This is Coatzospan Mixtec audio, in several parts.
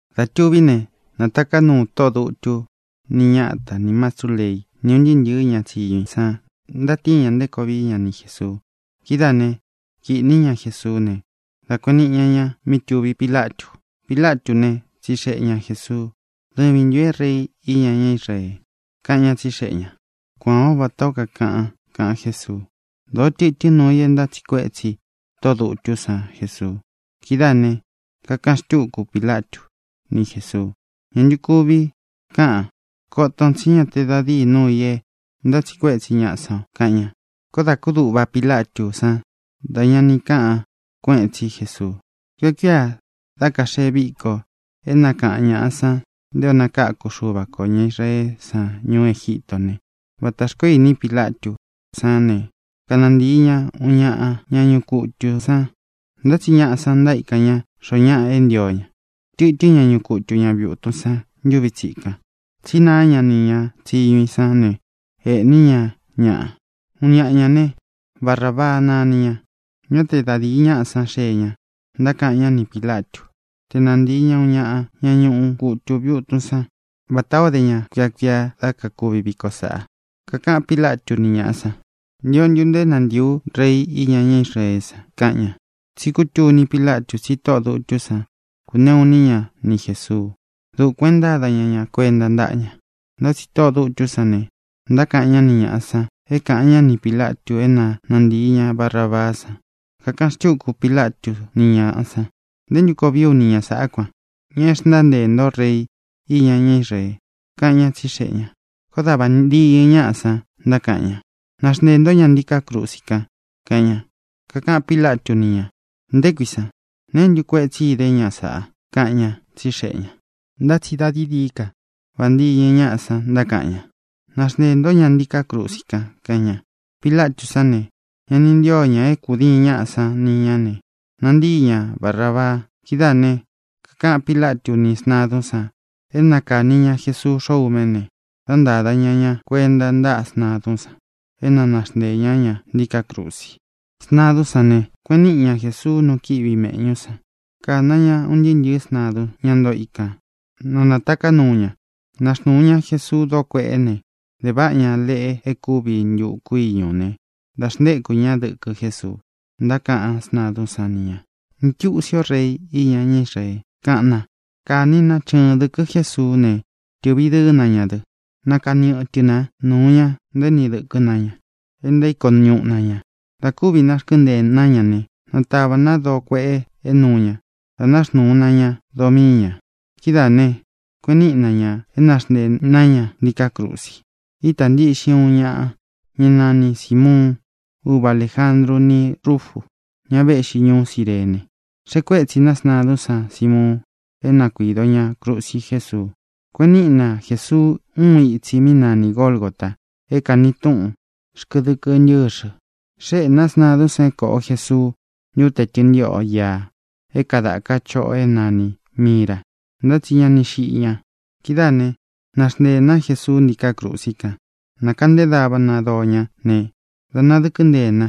Dā tuví ne, nātaká nuu tóꞌō dutú, ni ñata, nī mastrú leí, ni ūn ntɨɨ́ ntɨ̄ɨ́ ña tsiñu i san, ntatíin ña nté koo vií ña ni Jēsuu. Kidáā né, kīꞌní ña Jesuú ne, dā kueꞌen niꞌi ña ña mí tuví Pilatu. Pilatú ne, tsixeꞌe ña Jēsuu: —¿Dɨvīn ntun é Rei iña ñá Israee? —kaꞌan ñá, tsixeꞌe ñā. —Kuān ó vatā ó kakaꞌan —kaꞌan Jésuu. Dōó tɨtɨ́n nuu i é ntátsiꞌi kuétsi tóꞌō dutú san Jesuu. Kidáā ne, kakaꞌan xtúku Pilatu ni Jésuu: —¿Ñā ntu kuvi káꞌan? Koton tsi ñá te da dīi núu ī e ntátsiꞌi kuétsi ñaꞌa san o —kaꞌan ña. Koó dā kúduꞌva Pilatú san dá ña ni kaꞌan kuéꞌen tsi Jesuu. Kuia kuíā dá kaxee víko e nákaꞌan ñāꞌa san nté ō nakáku Xuva kō ña Israeé san ñuú Egítō né, vatā xkoó ini Pílatú san ne, kanantīi ñá uun ñaꞌa ña ñuꞌu kutū san, ntá tsi ñaꞌa san ntaíkan ña xōo ñáꞌa é ntio ña. Tɨtɨ́n ñaꞌa ñuꞌu kutu ña viūtun san ntuvi tsikan, tsí naá ña ni ña tsiñu ī sán ne, ēꞌní ña ñaꞌa. Uun ñaꞌa ñā né, Barabaa nani ña. Ñá te da dīi ñaꞌá san xee ña, ntákaꞌan ñá ni Pīlatu té nantīi ña uun ñaꞌa ña ñuꞌu kutu viūtun san, vatā ó de ña kuia kuia dá kakuvi viko sāꞌa. Kakaꞌan Pílatu ni ñaꞌá san: —¿Ntio ntu nto é nantiī ú Rei iña ñá Israeé san? —kaꞌan ña. Tsi kútuni Pílatu tsi tóꞌō dutú san kuneꞌu iní ña ni Jēsuu. Dukuān e ntáda ña ña kuenta ntáꞌa ña. Ntá tsi tóꞌō dutú san ne, ntákaꞌan ñá ni ñāꞌa san é kāꞌan ñá ni Pīlatu é na nantīi ña Barabaá san. Kakaꞌan xtúku Pilatu ni ñaꞌá san: —¿Nté ntu koo vií u ni ña sāꞌá kuan, ña e xntánteē ntó Rei iña ñá Israee? —kaꞌan ña, tsíxeꞌe ñā. Koó da vāntiñɨ ñáꞌa san ntákaꞌan ña: —¡Naxnteē ntó ña ntiká krusi kan! —kaꞌan ña. Kakaꞌan Pílatu ni ña: —¿Nté kui san? ¿Neé ntu kuetsi idé ña sāꞌa? —kaꞌan ña, tsíxeꞌe ñā. Ntá tsi dā dií dií ka vāntiñɨ ñáꞌa san ntákaꞌan ña: —¡Naxnteē ntó ña ntiká krusi kan! —kaꞌan ña. Pilatú san ne, ña ni ntío ña é kūdiin ñáꞌa san ni ñá, ne, nantíi ña Barābaa. Kidáā ne, kakaꞌan Pílatu ni sntadún san é na kāni ña Jesuu xóꞌo ūme ne, dá ntāda ña ña kuenta ntáꞌa sntadún san é na naxnteē ñá ña ntiká krusi. Sntadún san ne, kueꞌen níꞌi ña Jēsuu nu kíꞌi viꞌi mēꞌñú san. Kāna ña un ntɨɨ́ ntɨ̄ɨ́ sntadun, ñá ntoo ikān, na nātaká nuu ña. Naxnūu ña Jesuú doo kueꞌe, ne, de váꞌa ña leꞌe e kúvi ntuku íñū né, dā xntéku ña dɨkɨ Jésuu. Ntákaꞌan sntadún san ni ñā: —¡Ntiusi o, Rei iña ñá Israee! —kaꞌan na. Kāni na chɨɨn dɨkɨ Jésuú ne, tɨ̄ꞌvi dɨɨ́ na ña dɨ. Nakani ɨtɨ ná nuu ña, ntaéni dɨkɨ́ na ña e ntaíko ñuꞌu na ñā. Dā kúvi narkɨ́nteē ná ña ne, natāvá na doo kueꞌe é nuu ña, dā náxnuu na ña doo mii ña. Kidáā ne, kueꞌen níꞌi na ñā é naxnteē ná ña ntiká krusi. Ítā ntiꞌxin uun ñaꞌa, ñá nani Sīmuun, úva Alējandru ni Rúfu, ña véꞌxi ñuú Cirene. Xeꞌe kuétsi na sntadún san Simuun é na kuīdo ña krusi Jésuu. Kueꞌen níꞌi na Jēsuu uun itsi mí nani Gōlgota, é kāni túꞌun: Xkɨdɨkɨ Ntɨ́xɨ. Xéꞌē na sntadún san é kōꞌo Jesuu ntúte tɨntiꞌo íā é kadāka chóꞌō é nanī mira. Ntá tsi ña ni xiꞌi ña. Kidáā ne, náxnteē ná Jesuu ntíkā krusi kan. Nākaꞌnté dava na doo ñá ne, dā nadɨkɨ́ nteē na,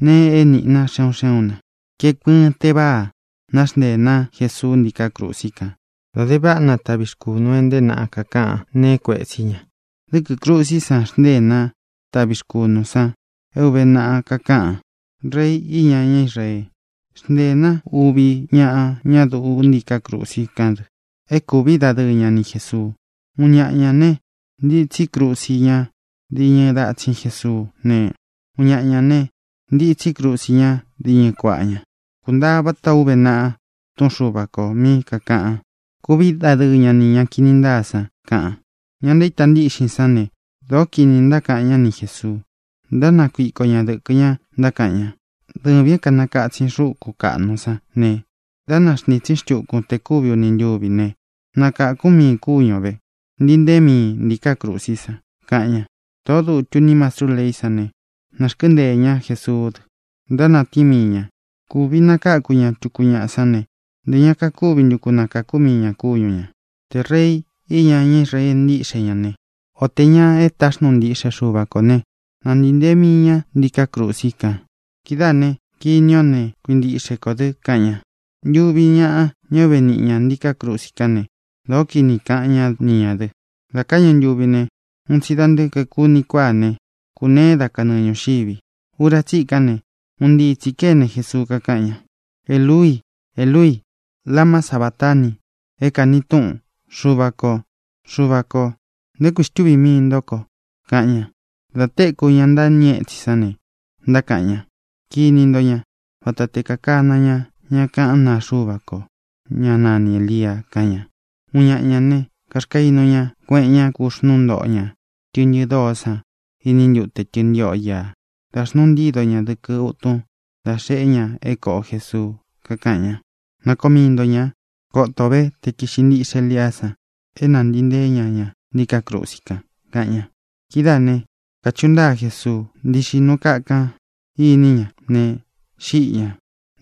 nee é niꞌi na, xé un xé un nā. Kaeku ɨɨn teváa náxnteē ná Jesuu ntíkā krusi kan. Dā de váꞌa na taꞌvi rkunū e nteé naꞌa kakaꞌan nee é kuētsí ña. Dɨ́kɨ̄ krusí san xntée ná taꞌvi rkunū san é ūve naꞌa kakáꞌan: “Rei iña ñá Israee”. Xnteē ná uvi ñaꞌa ñá duꞌu ntíkā krusi kán dɨ é kūví dadɨɨ ña ni Jēsuu. Uun ñaꞌa ñā ne, ntitsí krusi ña diñɨ datsin Jesuú ne, uun ñaꞌa ñā ne, ntitsí krusi ña diñɨ kuaꞌa ña. Kuntaa vatā ó uve naꞌa Túꞌun Xuva kō mí kakāꞌan: “Kuvi dadɨɨ ña ni ña kini ntáa san”, kaꞌan. Ña ntaíta ntíꞌxin sán ne, dōó kini ntákaꞌan ñá ni Jēsuu. Ntánakuiko ña dɨ̄kɨ ña, ntákaꞌan ña: —Dɨvīn é kanakatsin xukún kaꞌnu sán ne dá naxntītsín xtukun te kuvi uni ntúvi ne, nakākún miin kúñu ō ve. Ntii nteen miin ntíkā krusí san —kaꞌan ña. Tōꞌó dutu ni mastrú leí san ne, narkɨ́nteē ñá Jesuú dɨ. Ntánatíin mii ña: —Kuvi nakakū ñá tuku ñaꞌa sán ne, ntē ña kakúvi ntu ku nakāku mii ña kúñu ñā. Tē Rei iña ñá Israee ntíꞌxe ña ne, o tē ña é taxnuu ntiꞌxe Xuva kō né, na ntīi ntee mii ña ntiká krusi kan. Kidáā ne, kini ó ne, kuintiꞌxe kō dɨ —kaꞌan ña. Ntuvi ñáꞌa, ñá uve niꞌi ña ntīká krusi kán ne, dōó kini kaꞌan ñá ni ñā dɨ. Dā káꞌñu ntuvi ne, un tsi da nte kaeku uni kuáa ne, kūneé da kanɨɨ ñūxivi. Ura tsíkan ne, un ntii tsī kéne Jesuu, kakáꞌan ña: —Eluii, Eluii, ¿lama sabatani? (é kāni túꞌun: Xuvā kó, Xuvā ko, ¿nté kui xtuvī mii ntó ko?) —kaꞌan ña. Dā téku ña ntâñɨ étsin sán ne, ntákaꞌan ña: —Kini nto ña. Vata te kakana ña ña kaꞌán naa Xuva ko, ñá nani Ēlia —kaꞌan ña. Uun ñaꞌa ñā né, kaxkainu ña kueꞌen ña, kuxnúu ntoꞌo ña tɨꞌntɨ dóo san iní ntute tɨntiꞌo ía, dā xnuu ntído ña dɨkɨ útun, dā xeꞌé ña é kōꞌo Jesuu. Kakaꞌan ña: —Na koo mii nto ñā. Koto o ve te kīꞌxi ntíꞌxe Eliá san é nāntii nteé ña ña ntiká krusi kan —kaꞌan ña. Kidáā né, kāchuꞌu ntáa Jesuu, ntíꞌxi nuu kakan inī ñá ne, xíꞌi ñā.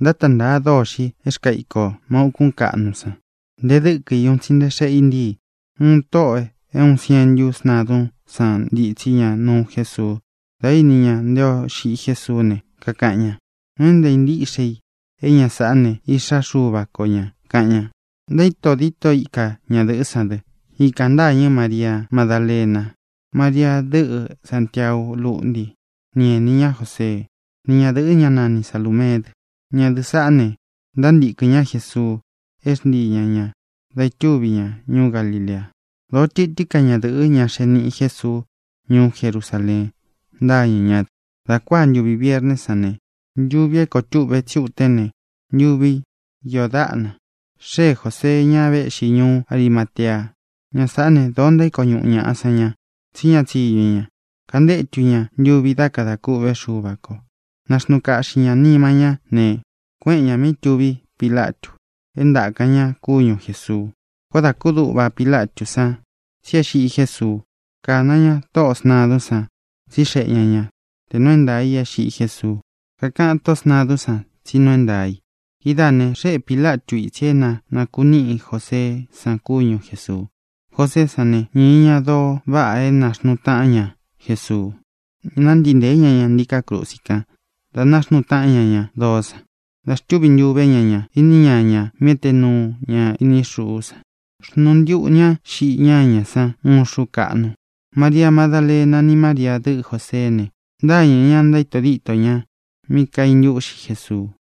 Ntáta ntāa dôxi é rkaa íko má ūkún kaꞌnu san. Nte dɨ́kɨ i un tsi nte xeꞌe i ntíi. Uun tóꞌō é uun sientu sntadún san ntitsí ña nuu Jésuu. Dā íni ña nté ō xiꞌi Jésuú ne, kakaꞌan ña: —Nuu é ntāa ntíꞌxe i é ña sāꞌá ne, Iꞌxá Xuva ko ñā —kaꞌan ña. Ntaíto díto ika ñadɨ̄ꞌɨ́ san dɨ. Ikān ntâñɨ Maria Madálena, María, dɨꞌɨ Sāntiau lúꞌnti ni enī ñá Joseé, ni ñadɨ̄ꞌɨ, ñá nani Salūmeé dɨ. Ñadɨꞌɨ̄ saꞌá ne, ntántīkɨn ñá Jesuu é xntii ña ñā da itúvi ña ñuú Galilea. Dōó tɨtɨ́n ka ñadɨ̄ꞌɨ́, ña xee niꞌi Jésuu ñuú Jerusaleen, ntâñɨ ñá dɨ. Dā kuáa ntuvi vierné san, ntuvi é koo túꞌve tsí utén ne, ntuvi iō dáꞌna, xée Jōsee, ña véꞌxi ñuú Arimatea. Ña sāꞌá ne, dōó ntaíko ñuꞌu ñaꞌa san ña, tsí ña tsiñu i ña. Kantétu ña ntūvi dá kada kúꞌve Xuva kō. Naxnuu kaꞌxi ñā nima ñá ne, kuéꞌen ñā mí tuví Pilatu é ntākan ña kúñu Jēsuu. Koó dā kúduꞌva Pilatú san tsí e xiꞌi Jésuu. Kāna ña tóꞌō sntadún san, tsíxeꞌe ña ña tē nuu é ntaā i é xiꞌi Jésuu. Kakaꞌan tóꞌō sntadún san tsí nuu é ntaā i. Kidáā ne, xéꞌe Pīlatu ítsi é na nākuníꞌi Joseé san kúñu Jēsuu. Joseé san ne, ñīi ña doo váꞌa é nāxnuu taꞌán ña Jesuu. Nántii ntēé ña ña ntiká krusi kán, dā náxnuu táꞌan ña ña doó san, dā xtúvi ntuvē ñá ña iní ñañā mí ete nuu ña ini xuú san. Xnuu ntiꞌu ñá xiꞌi ñáñā san uun xuú kaꞌnu. Maria Madálena ni María, dɨꞌɨ Jōseé ne, ntâñɨ ña, ntaíto dito ña mí kaintúꞌxi Jesuu.